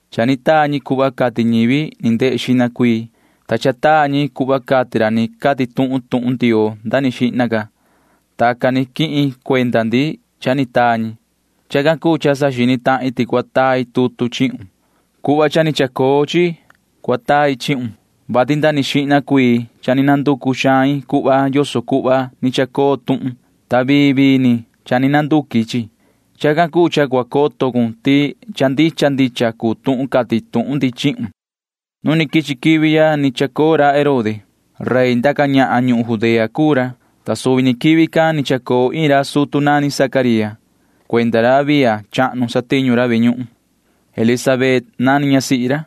Cha ni taa ñi cuhva cati ñivi ni ndehe xihna cuii, ta cha taa ñi cuhva cati ra ni cati tuhun tuhun Ndioo nda ni xihna. Tacan ni quihin cuenda ndi cha ni taa ñi. Chacan cuu cha saxini tahin ti cua tai tutu chihun. Cuhva cha ni chacoo chi tai chihun, vati nda ni xihna cuii cha ni nducu xain cuhva yoso cuhva ni chacoo tuhun, ta vii vii ni cha ni nduqui cuhva. Chacan cuu cha cua coto cun ti cha ndicha ndicha cuu tuhun cati tuhun ndi chihun. Nu quichi quivi cha ni chacoo ra Herode. Rey ndaca ñahan ñuhun Judea cuu ra, ta suvi ni quivi can ni chacoo iin ra sutu nani Zacaría. Cuenda ra Abía chahnu satiñu ra ve ñuhun. Elisabet nani ñasihi ra,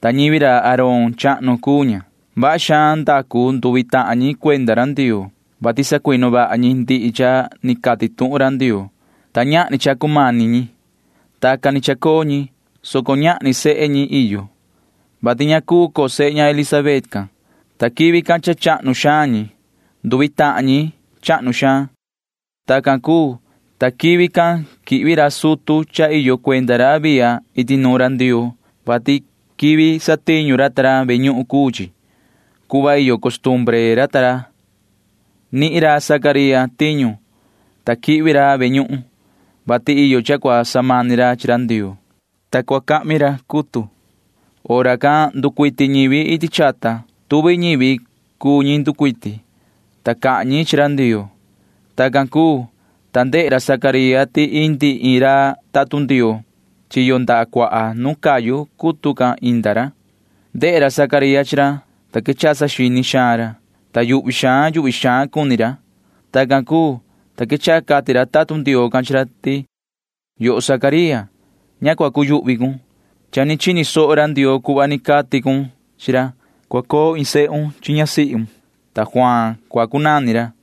ta ñivi ra Aarón chahnu cuu ña. Vaha xaan ndacu nduvi tahan ñi cuenda ra Ndioo, vati sacuinu vaha ñi ndihi cha ni cati tuhun ra Ndioo, ta ñahni cha cumani ñi. Tacan ni chacoo ñi, soco ñahni sehe ñi iyo chi ñi, vati ña cuu coo sehe ña Elisabet can, ta quivi can cha chahnu xaan ñi. Nduvi tahan ñi chahnu suhva. Tacan cuu, ta quivi can quihvi ra sutu ta ra iyo cuenda ra Abía iti nuun ra Ndioo, vati quivi satiñu ra ve ñuhun cuu chi. Cuhva iyo costumbre ra ta ra nihin ra Zacaría tiñu, ta quihvi ra ve ñuhun, vati iyo cha cua samani ra chi ra Ndioo, ta cua cahmi ra cutu. Hora can nducuiti ñivi iti chata. Tuvi ñivi cuu ñi nducuiti, ta cahan ñi chi ra Ndioo. Tacan cuu, ta ndehe ra Zacaría ti indi iin ra tatun Ndioo. Chiyo ndaha cuaha nu cayu cutu can indi ra. Ndehe ra Zacaría chi ra, ta quechaha saxini xaan ra, ta yuhvi xaan yuhvi xaan cuni ra. Tacan cuu, ta quechaha cati ra tatun Ndioo can chi ra ti: ―Yoho Zacaría, ña cua cuyuhvi cun. Cha ni chini soho ra Ndioo cuhva ni cati cun chi ra. Cua coo iin sehun chi ñasihun, ta Juaan cua cunani ra.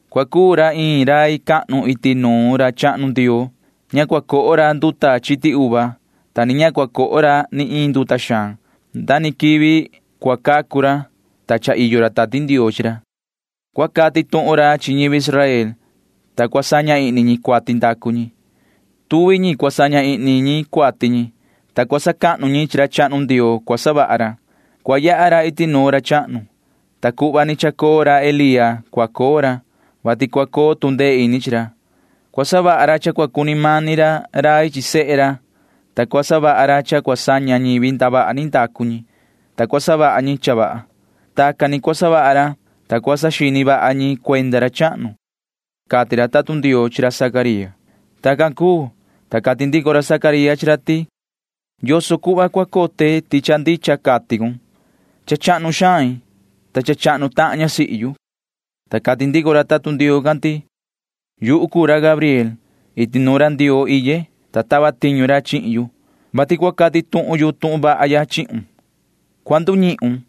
Cua cuu ra iin rai cahnu iti nuun ra chahnu Ndioo. Ña cua coho ra nduta chiti uva, ta ni ña cua coho ra ni iin nduta xaan. Nda ni quivi cua cacu ra, ta cha iyo ra Tati Ndioo chi ra. Cua cati tuhun ra chi ñivi Israel, ta cua saña ihni ñi cuati ndacu ñi. Tuvi ñi cua saña ihni ñi cuati ñi, ta cua sacahnu ñi chi ra chahnu Ndioo cua savaha ra. Cua yaha ra iti nuun ra chahnu, ta cuhva ni chacoo Elía cua coo ra, vati cua coo tu ndee ini chi ra. Cua savaha ra cha cua cuni mani ra rai chi sehe ra, ta cua savaha ra cha cua saña ñivi ndavaha ni ndacu ñi, ta cua savaha ñi cha vaha. Tacan ni cua savaha ra, ta cua saxini vaha ñi cuenda ra chahnu ―cati ra tatun Ndioo chi ra Zacaría. Tacan cuu, ta cati ndico ra Zacaría chi ra ti: ―¿Yoso cuhva cua cote ti cha ndicha cati cun? Cha chahnu xain, ta cha chahnu tahan ñasihi yu ―cati ra. Ta cati ndico ra tatun Ndioo can ti: ―Yuhu cuu ra Gabriel. Iti nuun ra Ndioo iye, ta tava tiñu ra chihin yu, vati cua cati tuhun yu tuhun vaha ya chihun. Cua nduñihun.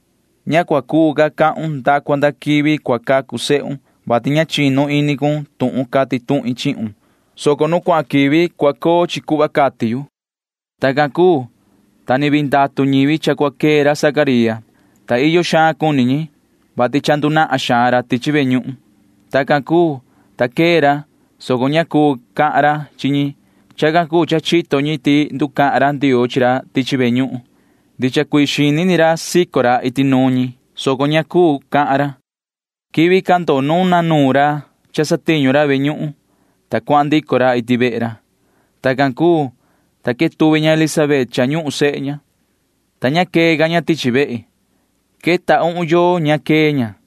Ña cua cuu cahan con nda cua nda quivi cua cacu sehun, vati ña chinu ini cun tuhun cati tuhin chihun, soco nu cuahan quivi cua coo chi cuhva cati yu ―cati ra. Tacan cuu, ta ni vii ndatu ñivi cha cua quee ra Zacaría, ta iyo xaan cuni ñi, vati nahan xaan nducuee ra tichi ve ñuhun. Tacan cuu, ta quee ra, soco ña cuu cahan ra chi ñi. Chacan cuu cha chito ñi ti nducahan ra Ndioo chi ra tichi ve ñuhun. Ndicha cuii xini ni ra sico ra chi ñi, soco ña cuu cahan ra. Quivi can nuna nuun ra cha satiñu ra ve ñuhun, ta cuahan ndico ra iti vehe ra. Tacan cuu, ta quetuvi ña Elisabet cha ñuhun sehe ña, ta ña quee ca ña tichi vehe. Queta uhun yoo ña quee ña,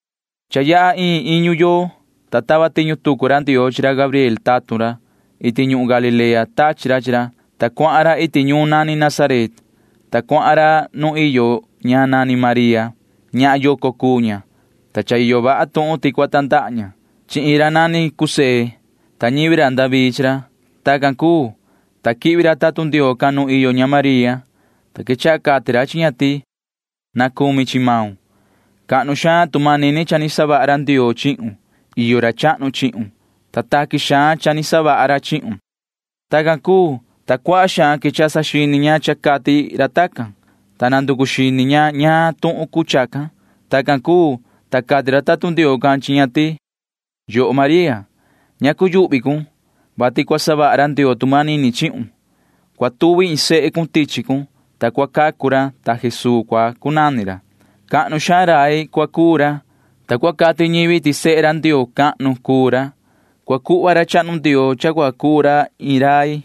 Cha yaha iin iñu yoo, ta tava tiñu tucu ra Ndioo chi ra Gabriel tatun ra. Iti ñuhun Galilea tachi ra chi ra, ta cuahan ra iti ñuun nani Nazaret, ta cuahan ra nuun iyo ña nani María. Ñahan yoco cuu ña, ta cha iyo vaha tuhun ti cua tandaha ña. Chi iin ra nani José cua tandaha ña, ta ñivi ra David chi ra. Tacan cuu, ta quihvi ra tatun Ndioo can nu iyo ña María, ta quechaha cati ra chi ña ti: ―¡Na cumi chi maun! Cahnu xaan tu manini cha ni savaha ra Ndioo chihun. Iyo ra chahnu chihun, ta taqui xaan cha ni savaha ra chihun ―cati ra. Tacan cuu, ta cuaha xaan quechaha saxini xaan ña ti cha cati ra tacan, ta nanducu xini ña ñaan tuhun cuu chacan. Tacan cuu, ta cati ra tatun Ndioo can chi ña ti: ―Yoho María, ña cuyuhvi cun, vati cua savaha ra Ndioo tu manini chihun. Cua tuvi iin sehe cun tichi cun, ta cua cacu ra, ta Jesuu cua cunani ra. Cahnu xaan rai cua cuu ra, ta cua cati ñivi ti sehe ra Ndioo cahnu cuu ra. Cua cuhva ra chahnu Ndioo cha cua cuu ra iin rai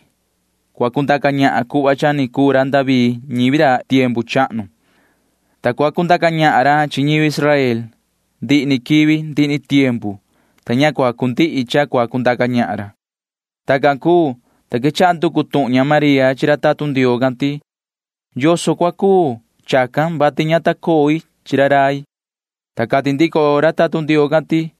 ndaca ñahan cuhva cha ni cuu ra David ñivi ra iti chata tiempu chahnu, ta cua cundaca ñahan ra chi ñivi Israel ndihi ni quivi ndihi ni tiempu, ta ña cua cundihi cha cua cundaca ñahan ra ―cati ra. Tacan cuu, ta quechaha nducu tuhun ña María chi ra tatun Ndioo can ti: ―¿Yoso cua cuu chacan, vati ña ta coi chi ra rai? ―cati ña. Ta cati ndico ra tatun Ndioo can ti: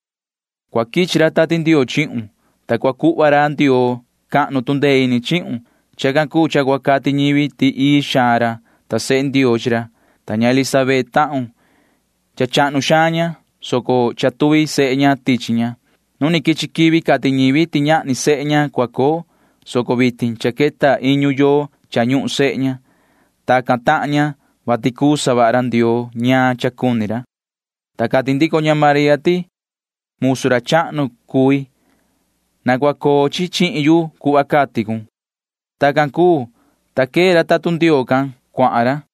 ―Cua quichi ra Tati Ndioo chihun, ta cua cuhva ra Ndioo cahnu tu ndee ini chihun. Chacan cuu cha cua cati ñivi ti ii xaan ra, ta sehe Ndioo chi ra. Ta ña Elizabet tahun―cha chahnu xaan ña, soco cha tuvi sehe ña tichi ña. Nu quichi quivi cati ñivi ti ñahni sehe ña cua coo, soco vitin cha queta iñu yoo cha ñuhun sehe ña. Tacan tahan ña, vati cuu savaha ra Ndioo ñaan cha cuni ra ―cati ra. Ta cati ndico ña María ti: ―Musu ra chahnu cui. Na cua coo chi chihin yu cuhva cati cun ―cati ña. Tacan cuu, ta quee ra tatun Ndioo can cuahan ra.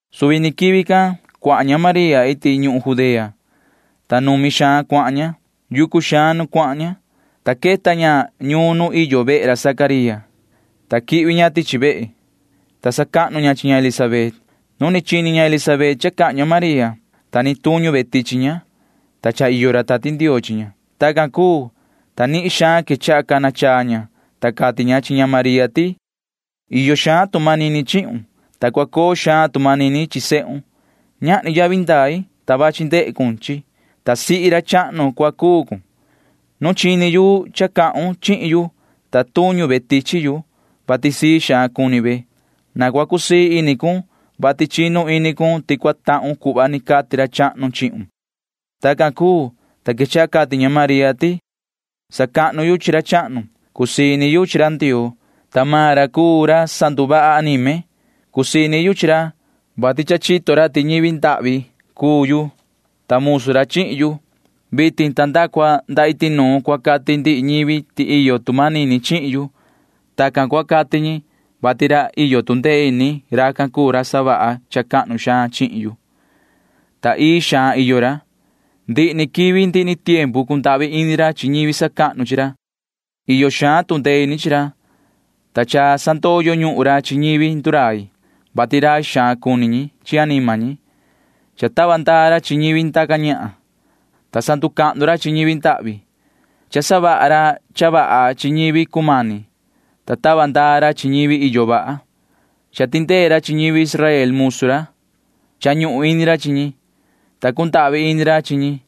Suvi ni quivi can cuahan ña María iti ñuhun Judea, ta numi xaan cuahan ña. Yucu xaan nu cuahan ña, ta queta ña ñuun nu iyo vehe ra Zacaría, ta quihvi ña tichi vehe, ta sacahnu ña chi ña Elisabet. Nu ni chini ña Elisabet cha cahan ña María, ta ni tuñu ve tichi ña, ta cha iyo ra Tati Ndioo chi ña. Tacan cuu, ta nihin xaan quechaha cana chaa ña, ta cati ña chi ña María ti: ―Iyo xaan tu manini chihun, ta cua coo xaan tu manini chi sehun. Ñahni yavi ndai, ta chi main quichi cun, ta sihi ra chahnu cua cuu cun. Nu chini yu cha cahun chihin yu, ta tuñu ve tichi yu, vati sii xaan cuni ve. Na cua cusii ini cun, vati chinu ini cun ti cua tahun cuhva ni cati ra chahnu chihun ―cati ña. Tacan cuu, ta quechaha cati ña María ti: Sacahnu yu chi ra chahnu. Cusii ini yu chi ra Ndioo, ta maan ra cuu ra sanduvaha anime. Cusii ini yu chi ra, vati cha chito ra ti ñivi ndahvi cuu yu, ta musu ra chihin yu. Vitin ta nda cua nda iti nuun cua cati ndihi ñivi ti iyo tu manini chihin yu. Tacan cua cati ñi, vati ra iyo tu ndee ini―racan cuu ra savaha cha cahnu xaan chihin yu, ta ii xaan iyo ra. Ndihi ni quivi ndihi ni tiempu cundahvi ini ra chi ñivi sacahnu chi ra. Iyo xaan tu ndee ini chi ra, ta cha sandoyo ñuhun ra chi ñivi ndurai, vati rai xaan cuni ñi chi anima ñi. Cha tava ndaa ra chi ñivi ndaca ñahan, ta sacahnu ra chi ñivi ndahvi. Cha savaha ra cha vaha chi ñivi cumani, ta tava ndaa ra chi ñivi iyo vaha. Cha tindee ra chi ñivi Israel musu ra. Cha ñuhun ini ra chi ñi, ta cundahvi ini ra chi ñi.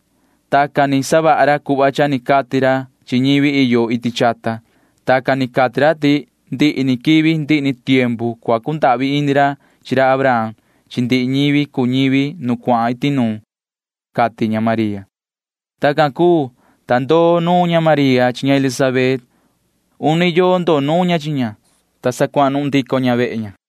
Tacan ni savaha ra cuhva cha ni cati ra chi ñivi yo iti chata. Tacan ni cati ra ti ndihi ni quivi ndihi ni tiempu cua cundahvi ini ra chi ra Abraham chi ndihi ñivi cuu ñivi ra iti nuun ―cati ña María. Tacan cuu, ta ndoo nuun ña María chi ña Elisabet. Uni yoo ndoo nuun ña chi ña, ta sa cuanuhun ndico ña vehe ña.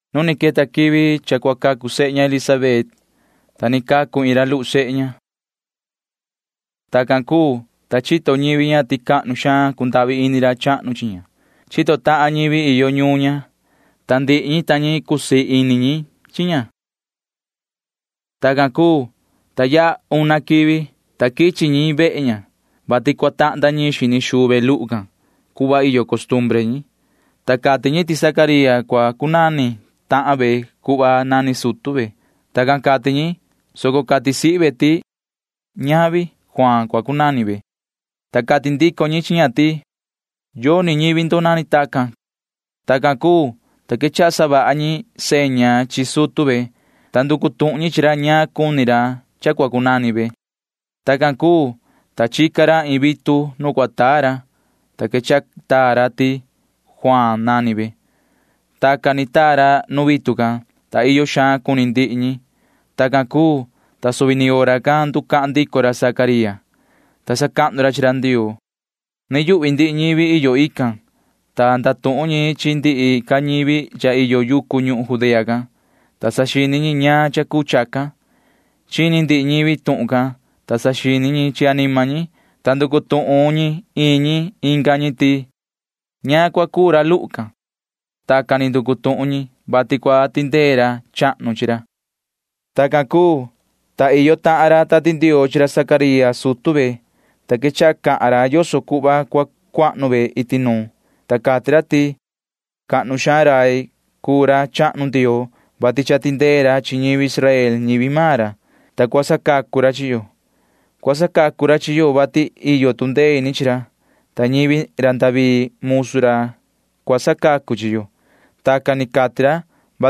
Nu ni queta quivi cha cua cacu sehe ña Elisabet, ta ni cacu iin ra luhu sehe ña. Tacan cuu, ta chito ñivi ña ti cuaha xaan cundahvi ini ra chahnu chi ña. Chito tahan ñivi iyo ñuun ña, ta ndihi ñi ta ñi cusii ini ñi chi ña. Tacan cuu, ta yaha una quivi, ta quichi ñi vehe ña, vati cua tahnda ñiin xini xuu ve luhu can [cuhva iyo costumbre ñi], ta cati ñi ti cua cunani tahan ve Zacaría cuhva nani sutu ve. Tacan cati ñi, soco cati sihi ve ti: ―Ñavi. Juaan cua cunani ve ―cati ña. Ta cati ndico ñi chi ña ti: ―Yoni ñivi ndo nani tacan ―cati ñi. Tacan cuu, ta quechaha savaha ñi seña chi sutu ve, ta nducu tuhun ñi chi ra yoso cuni maan ra cha cua cunani ve. Tacan cuu, ta chica ra iin vitu nu cua taa ra, ta quechaha taa ra ti Juaan nani ve. Tacan ni taa ra nu vitu can, ta iyo xaan cuni ndihi ñi. Tacan cuu, ta suvi ni hora can nducahan ndico ra Zacaría, ta sacahnu ra chi ra Ndioo. Yuhvi cuni ndihi ñivi iyo tican, ta cahan ndihi ñivi chi tahan ñi iyo yucu can ñuhun Judea can, ta saxini ñi ñaan cha cuu chacan. Chini ndihi ñivi tuhun can, ta saxini ñi chi anima ñi, ta nducu tuhun ñi iin ñi inga ñi ti: ―¿Ñaan rai cua cuu racan? Tacan ni nducu tuhun ñi, vati cua tindee ra chahnu chi ra. Tacan cuu, ta iyo tahan ra Tati Ndioo chi ra Zacaría sutu ve, ta quechaha cahan ra yoso cuhva cua cuahnu ve iti nuun, ta cati ra ti: Cahnu xaan rai cuu ra chahnu Ndioo, vati cha tindee ra chi ñivi Israel ñivi maan ra, ta cua sacacu ra chi yo. Cua sacacu ra chi yo, vati iyo tu ndee ini chi ra, ta ñivi ra David musu ra cua sacacu chi yo. Tacan ni cati ra,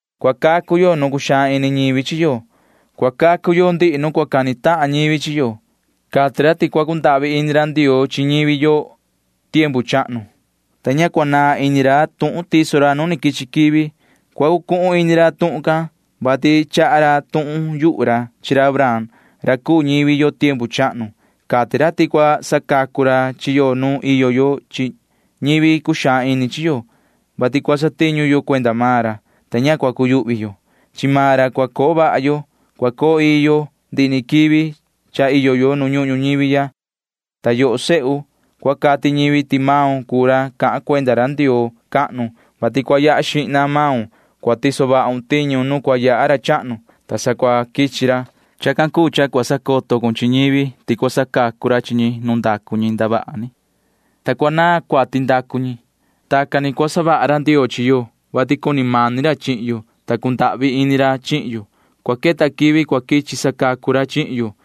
cua cacu yo nu cuxaan ini ñivi chi yo. Cua cacu yo ndihi nu cani tahan ñivi chi yo. Cati ra ti cua cundahvi ini ra Ndioo chi ñivi yo tiempu chahnu, ta ña cua naan ini ra tuhun tiso ra nu quichi quivi. Cua cucuhun ini ra tuhun can, vati cahan ra iin cha rai chi ra Abraham ra cuu ñivi yo tiempu chahnu. Cati ra ti cua sacacu ra chi yo nu iyo yo chi ñivi cuxaan ini chi yo, vati cua satiñu yo cuenda maan ra, ta ña cua cuyuhvi yo. Chi maan ra cua coo vaha yo. Cua coo ii yo ndihi ni quivi cha iyo yo nu ñuhun ñuñivi. Ta yoho sehu, cua cati ñivi ti maun cuu ra cahan cuenda ra Ndioo cahnu, vati cua yaha xihna maun. Cua tiso vahun tiñu nu cua yaha ra chahnu, ta sa cua quichi ra. Chacan cuu cha cua sacoto cun chi ñivi ti cua sacacu ra chi ñi nu ndacu ñi ndavaha ni, ta cua naan cuati ndacu ñi. Tacan ni cua savaha ra Ndioo chi yo, vati cuni mani ra chihin yo, ta cundahvi ini ra chihin yo. Cua queta quivi cua quichi sacacu ra chihin yo.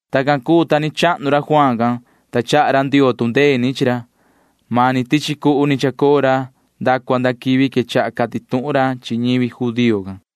Tacan cuu, ta ni chahnu ra Juaan can, ta chaha ra Ndioo tu ndee ini chi ra. Mani tichi cuhu ni chacoo ra nda cua nda quivi quechaha cati tuhun ra chi ñivi judío can.